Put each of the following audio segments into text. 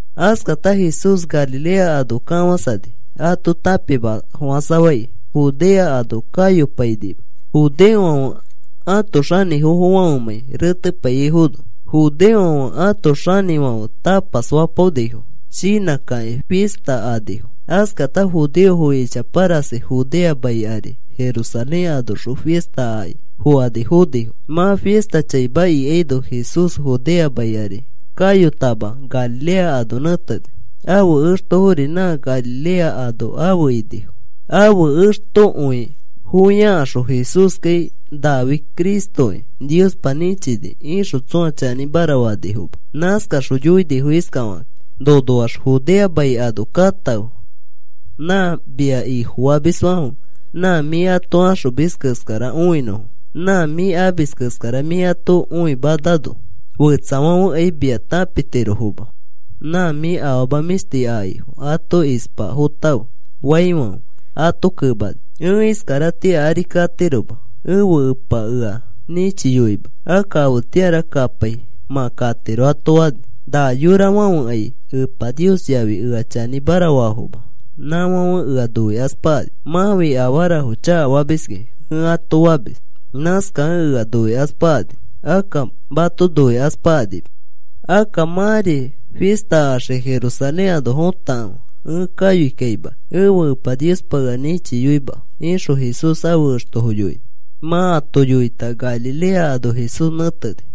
Askata Jesús Galilea ano kafãsani ato tãpimafofãsafai. Judea ano kayopainima judeofãfe ãto xanĩfofãfemãi retepaiyaifono. Judeofãfe ãto xinifãfe tapas fapaonifo shinãkakĩ fista anifo. Askata judeofo ichapa rasi Judea mai ari Jerusalén anoxõ fista aki fokani fonifo. Mã fista chaima ikaino Jesús Judea mai ari kayotama, Galilea ano nẽteni. Ãfe extofori nã Galilea ano afe inifo. Ãfe extokõifofiakaxõ Jesúskai nafi Cristoki Niospa nĩchini ixõ tsõa chanĩmara fanifoma. Nãskaxõ yoinifo iskafakakĩ: “Nonoax Judea mai ano katãfe nã mia Ifofamisfãfe nã mĩ ato axomis keskara õinõfo. Nã mĩ amis keskara mĩ ato õimanamano fetsafãfekai mia tãpitirofoma. Nã mĩ afama mĩshti akaifo ato ispafotãfe,” faifãfe ato kemani: “Ẽ iskaratĩa ari katiroma. Ẽfe Epa ea nĩchiyoima. Akka afetĩara kapai mã katiro,” ato fani. “Na yorafãfekai Epa Nios yafi ea chanĩmara faafoma. Nãfãfe ea noikaspakani. ‘Mãfi afarafo chakafamis,’ ẽ ato famis. Nãskakẽ ea noikaspakani. Akka mato noikaspakanima. Akka mãri fista axiki Jerusalén ano fotakãfe. Ẽ kayoikaima. Ẽfe Epa Niospa ea nĩchiyoima,” ixõ Jesús ãfe extofo yoini. Mã ato yoita Galilea ano Jesús nẽteni.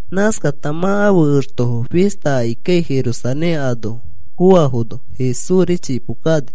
Nãskata mã ãfe extofo fista akikai, Jerusalén ano foafono Jesúsri chipo kani.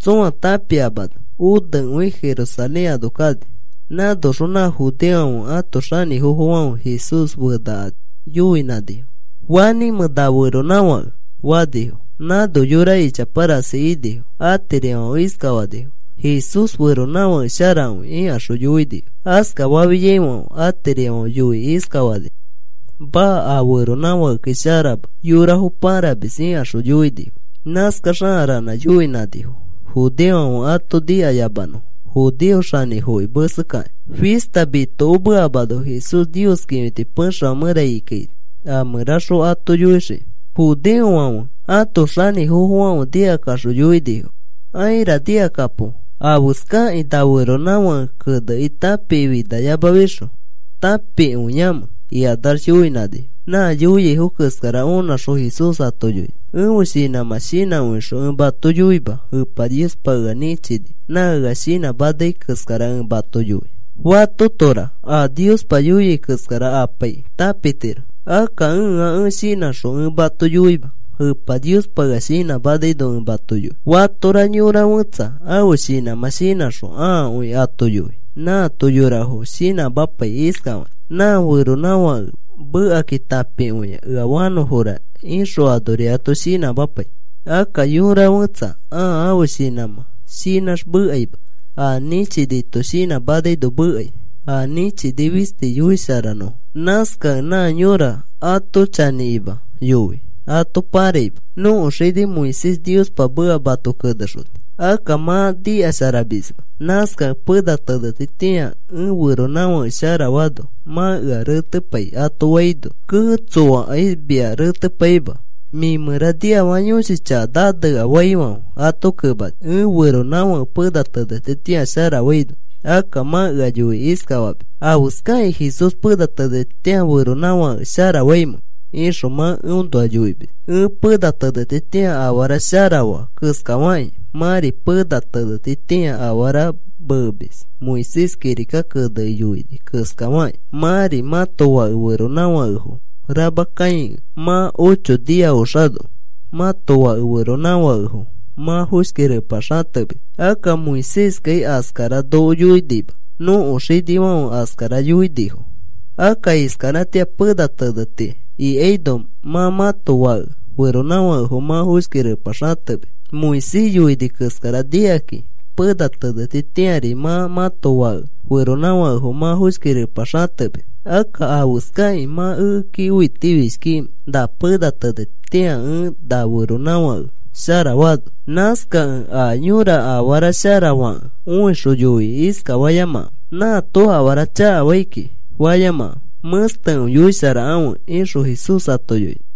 Tsõa tãpiamano onekõi Jerusalén ano kani. Nãnoxõ nã judeofãfe ãto xanĩfofofãfe Jesús fenakani yoinãnifo: “¿Fanĩmẽ nã feronãfake?” fanifo. Nãno yora ichapa rasi inifo. Atirifãfe iskafanifo: “Jesús feronãfake sharakõi,” ikaxõ yoinifo. Askafafiaifãfe atirifãfe yoikĩ iskafanifo: “Maa. A feronãfakekai sharama. Yorafo pãramis,” ikaxõ yoinifo. Nãskax a ranã yoinãnifo judeofãfe ato nikayamanõfo judeo xanĩfofoki mesekakĩ. Fista mitokomeamano Jesús Nios kĩfiti pexefã mẽra ikikaini a mẽraxõ ato yoixikĩ. Judeofãfe ãto xanĩfofofãfe nikakaxõ yoinifo: “Aira. Nikakapo. ¿Afeskakĩ na feronãfãke kenekĩ tãpikĩ finayamafixõ tãpifinakõiamẽ?” ikanax yoinãnifo. Nã yoiaifo keskara onãxõ Jesús ato yoini: “Ẽfe shinãmã shinãkõixõ ẽ mato yoima. Epa Niospa ea nĩchini nã ea shinãmanai keskara ẽ mato yoi. Fatotora a Niospa yoiai keskara apaikĩ tãpitiro akka ẽa ẽ shinãxõ ẽ mato yoima, Epa Niospa ea shinãmanaino ẽ mato yoi. Fatora yora fẽtsa ãfe shinãmã shinãxõ ãakõi ato yoi. Nãato yorafo shinãmapai iskafakĩ: ‘Nã feronãfãke mekakĩ tãpikõia, ea fanõfora,’ ixõ anori ato shinãmapai. Akka yõra fẽtsa ãa ãfe shinãmã shinãx mekaima. A nĩchinito shinãmanaino mekai, a nĩchini fisti yoisharanõfo. Nãskakẽ nã yõra ato chanĩkima yoi, ato pãraima. Nõko xini Moisés Niospa meka mato kenexoni. Akka mã nikasharamisma. Nãskakẽ pena tenetitĩa ẽ feronãfake sharafaano mã ea retepai,” ato faino, “Kee. Tsoakai mia retepaima. Mĩ mẽra niafaka yõshi chaka nanea,” faifãfe ato kemani: “Ẽ feronãfake pena tenetitĩa sharafaino akka mã ea yoikĩ iskafamis: ‘¿Afeskakĩ Jesús pena tenetitĩa feronãfake sharafaimẽ?’ ixõ mã eõnoa yoimis. Ẽ pena tenetitĩa afara shara faa keskafakĩ mãri pena tenetitĩa afara memis. Moisés kirika kenekĩ yoini keskafakĩ mãri mãto fake feronãfakefo rama kãikẽ mã ocho nia oxano mãto fake feronãfakefo mã foshki repa xatemis. (Akka Moiséskai askara noko yoinima, nõko xinifãfe askara yoinifo.) Akka iskaratĩa pena teneti ikaino mã mãto fake feronãfakefo mã foshki repa xatemis. “Moisés yoini keskara nikakĩ pena tenetitĩari mã mãto fake feronãfakefo mã foshki repa xatemis. Akka, ¿afeskai mã ekeki õitifishkikimẽ na pena tenetitĩa ẽ na feronãfake sharafaano? Nãskakẽ a yõra afara shara fakẽ õixõ yoikĩ iskafayamakãfe: ‘Nãto afara chakafai kiki,’ fayamakãfe. Mẽstekõi yoisharakãfe,” ixõ Jesús ato yoini.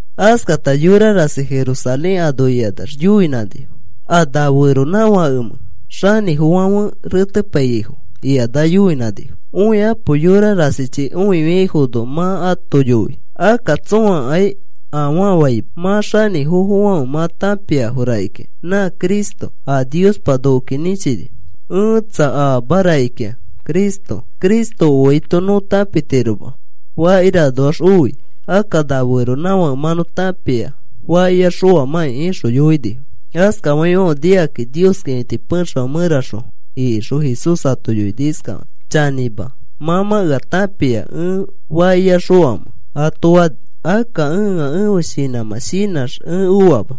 Askata yora rasi Jerusalén ano ikanax yoinãnifo: “¿A na feronãfakemẽ xanĩfofofãfe retepaiyaifo?” ikanax yoinãnifo: “Õikapo, yorafã rasichi õifiaifono mã ato yoi. Akka tsõakai afaa faima. Mã xanĩfofofãfe mã tãpiafo rakikĩa nã Cristo, a Niospa nokoki nĩchini. Ẽtsa, aama rakikĩa Cristo. Cristo oaito nõ tãpitiroma fakiranoax oi. Akka na feronãfake mã nõ tãpia fakiax oamãki,” ixõ yoinifo. Askafaifãfe nikaxõ Nios kĩfiti pexefã mẽra ikixõ Jesús ato yoini iskafakĩ: “Chanĩma, mã mã ea tãpia ẽ fakiax oamẽ,” ato fani. “Akka ẽa ẽfe shinãmã shinãx ẽ oama.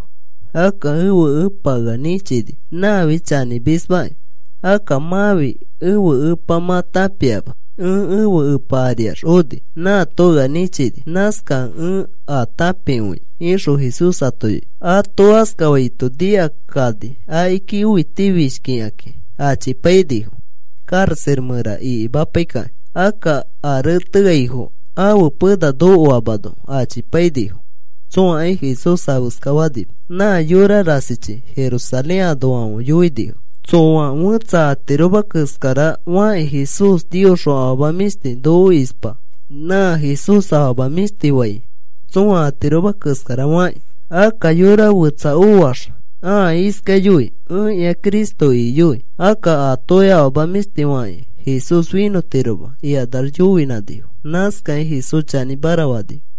Akka ẽfe Ẽpa ea nĩchini. Nãfi chanĩmismaki. Akka mãfi ẽfe Epa mã tãpiama. Ẽ ẽfe Epa ariax oni. Nãato ea nĩchini. Nãskakẽ ẽ a tãpikõia,” ixõ Jesús ato yoini. Ato askafaito nikakani akiki õitifishki ikakĩ achipainifo karaxa mẽra ikimapaikakĩ. Akka a reteaifo ãfe pena nokoamano achipainifo. Tsõakai Jesús afeska fanima. Nã yorafã rasichi Jerusalén anoafãfe yoinifo: “Tsoa fẽtsa atiroma keskara fakĩ Jesús Niosxõ afama mĩshti noko ispa. Nã Jesús afama mĩshti fai tsõa atiroma keskara fakĩ. Akka yora fetsa oax ãa iskai yoi: ‘Ẽkĩa Cristo,’ iki yoi. Akka atokai afama mĩshti fakĩ Jesús finõtiroma,” ikanax yoinãnifo. Nãskakĩ Jesús chanĩmara fanifo.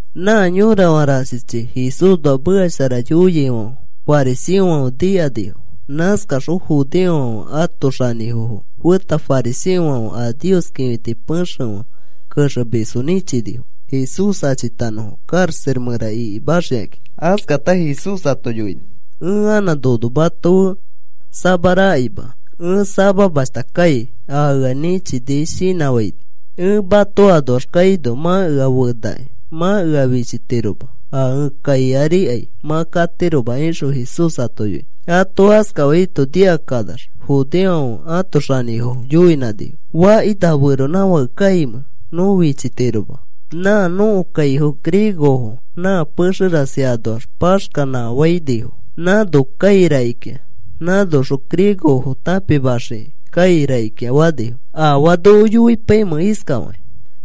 Nã yorafã rasichi Jesúsnoa meka shara yoiaifãfe fariseofãfe nikanifo. Nãskaxõ judeofãfe ãto xanĩfofo feta fariseofãfe a Nios kĩfiti pexefã kexemisfo nĩchinifo Jesús achitanõfo karaxa mẽra ikimaxikakĩ. Askata Jesús ato yoini: “Ẽ anã nono mato fe samarakaima. Ẽ samamashta kai a ea nĩchini shinãfãini. Ẽ mato anoax kaino mã ea fenakĩ mã ea fichitiroma. A ẽ kai arikai mã katiroma,” ixõ Jesús ato yoini. Ato askafaito nikakanax judeofãfe ãto xanĩfofo yoinãnifo: “¿Faki na feronãfake kaimẽ nõ fichitiroma? Nã nõko kaifo griegofo nã pexe rasi anoax paxkafainifo nãno kai rakikĩa. Nãnoxõ griegofo tãpimaxikĩ kai rakikĩa,” fanifo. “¿Afaa noko yoipaimẽ iskafakĩ?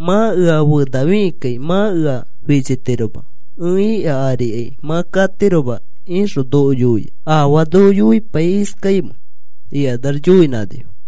‘Mã ea fenafikikai mã ea fichitiroma. Ẽ ika arikai mã katiroma,’ ixõ noko yoiai. ¿Afaa noko yoipai iskaimẽ?” ikanax yoinãnifo.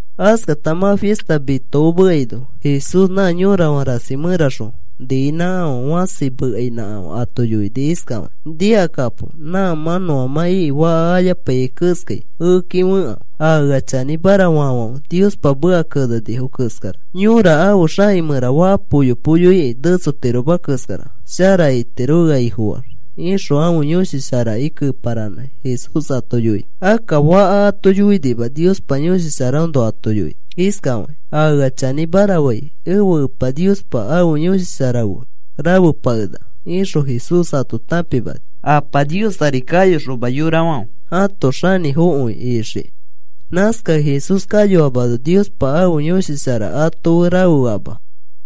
Askata mã fista mitokomeaino Jesús nã yorafã rasi mẽraxõ niinãkafã fãsi mekainãkafã ato yoini iskafakĩ: “Nikakapo. Nã mã nõamã iki faka ayapaiyai keskai ekeki fekãfe. A ea chanĩmara faafãfe Niospa meka kenenifo keskara yora ãfe xaki mẽra faka poyo poyo iki netsotiroma keskara shara itiro ea Ifofaax,” ixõ ãfe Yõshi Sharaki keparanãkĩ Jesús ato yoini. Akka faka ato yoinima, Niospa Yõshi Sharaõnoa ato yoini iskafakĩ: “A ea chanĩmara fai ẽfe Epa Niospa ãfe Yõshi Shara fe rafepakenaka,” ixõ Jesús ato tãpimani Apa Nios ari kayoxoma yorafãfe ãto xanĩfokõi ixikĩ. Nãskakẽ Jesús kayoamano Niospa ãfe Yõshi Shara ato fe rafeama.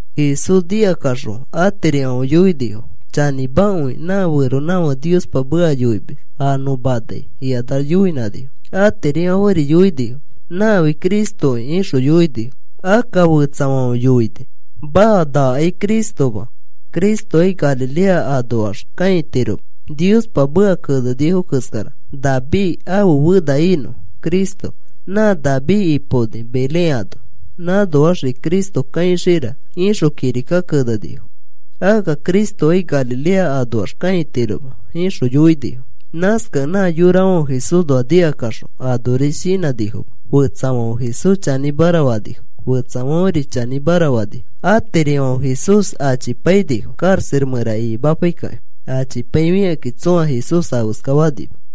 Jesús nikakaxõ atirifãfe yoinifo: “Chanĩmakõi nã feronãfake Niospa meka yoimis a nõ manai,” ikanax yoinãnifo. Atirifãferi yoinifo: “Nãfi Cristoki,” ixõ yoinifo. Akka fetsafãfe yoini: “Maa, nakai Cristoma. Cristokai Galilea anoax kãitiroma. Niospa meka kenenifo keskara, ‘David ãfe fena inõ Cristo. Nã David ipaoni Belén ano. Nãnoaxri Cristo kãixira,’ ixõ kirika kenenifo. Akka Cristokai Galilea anoax kãitiroma,” ixõ yoinifo. Nãskakẽ nã yorafãfe Jesúsnoa nikakaxõ anoris shinãnifoma. Fetsafãfe Jesús chanĩra fanifo, fetsafãferi chanĩmara fanifo. Atirifãfe Jesús achipainifo karaxa mẽra ikimapaikakĩ. Achipaifikakĩ tsõa Jesús afeska fanima.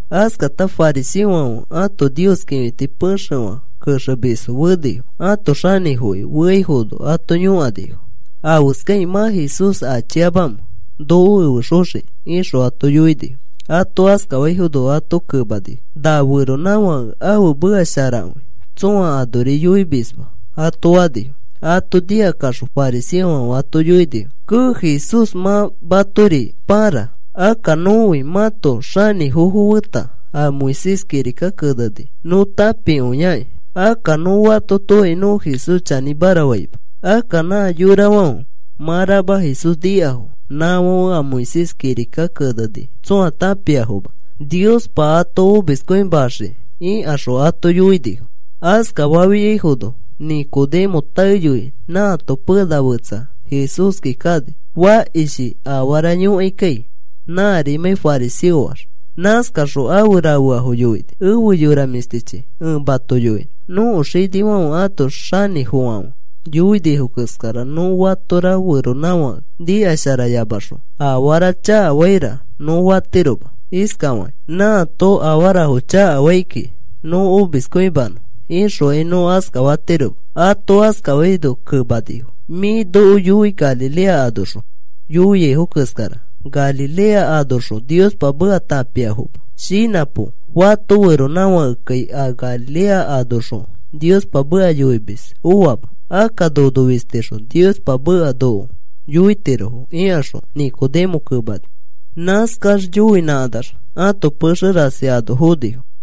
Askata fariseofãfe ãto Nios kĩfiti pexefã kexemisfo fenifo. Ãto xanĩfofoki feaifono ato yõkanifo: “¿Afeskakĩ mã Jesús achiamamẽ noko efexoxikĩ?” ixõ ato yoinifo. Ato askafaifono ato kemanifo: “Na feronãfãke ãfe meka sharakõi, tsõa anori yoimisma,” ato fanifo. Ato nikakaxõ fariseofãfe ato yoinifo: “Kee, Jesús mã matori pãra. Akka nõfi mãto xanĩfofo feta a Moisés kirika keneni nõ tãpikõiakĩ. Akka nõ fatotokai nõ Jesús chanĩmara faima. Akka nã yorafãfe mã rama Jesús nikafo nãfãfe a Moisés kirika keneni tsõa tãpiafoma. Niospa ato omiskõimaxiki,” ikaxõ ato yoinifo. Askafafiaifono Nicodemo taeyoi nãato pena fetsa Jesúski kani fakishi afara yõkaikai. Nãrimãi fariseoax nãskaxõ afe rafeafo yoini: “Efe yora mĩshtichi, ẽ mato yoinõ. Nõko xinifãfe ãto xanĩfofãfe yoinifo keskara nõ fatora feronãfake nikasharayamaxõ, ‘Afara chakafaira,’ nõ fatiroma iskafakĩ: ‘Nãto afarafo chakafai kiki nõ omiskõimanõ,’ ixokai nõ askafatiroma,” ato askafaino kemanifo: “Mĩ noko yoi Galilea anoxõ yoiaifo keskara. Galilea anoxõ Niospa meka tãpiafoma. Shinãpo. Fato feronãfakekai a Galilea anoxõ Niospa meka yoimis oama. Akka nono fistixõ Niospa meka noko yoitirofo,” ikaxõ Nicodemo kemanifo. Nãskax yoinãkanax ãto pexe rasi ano fonifo.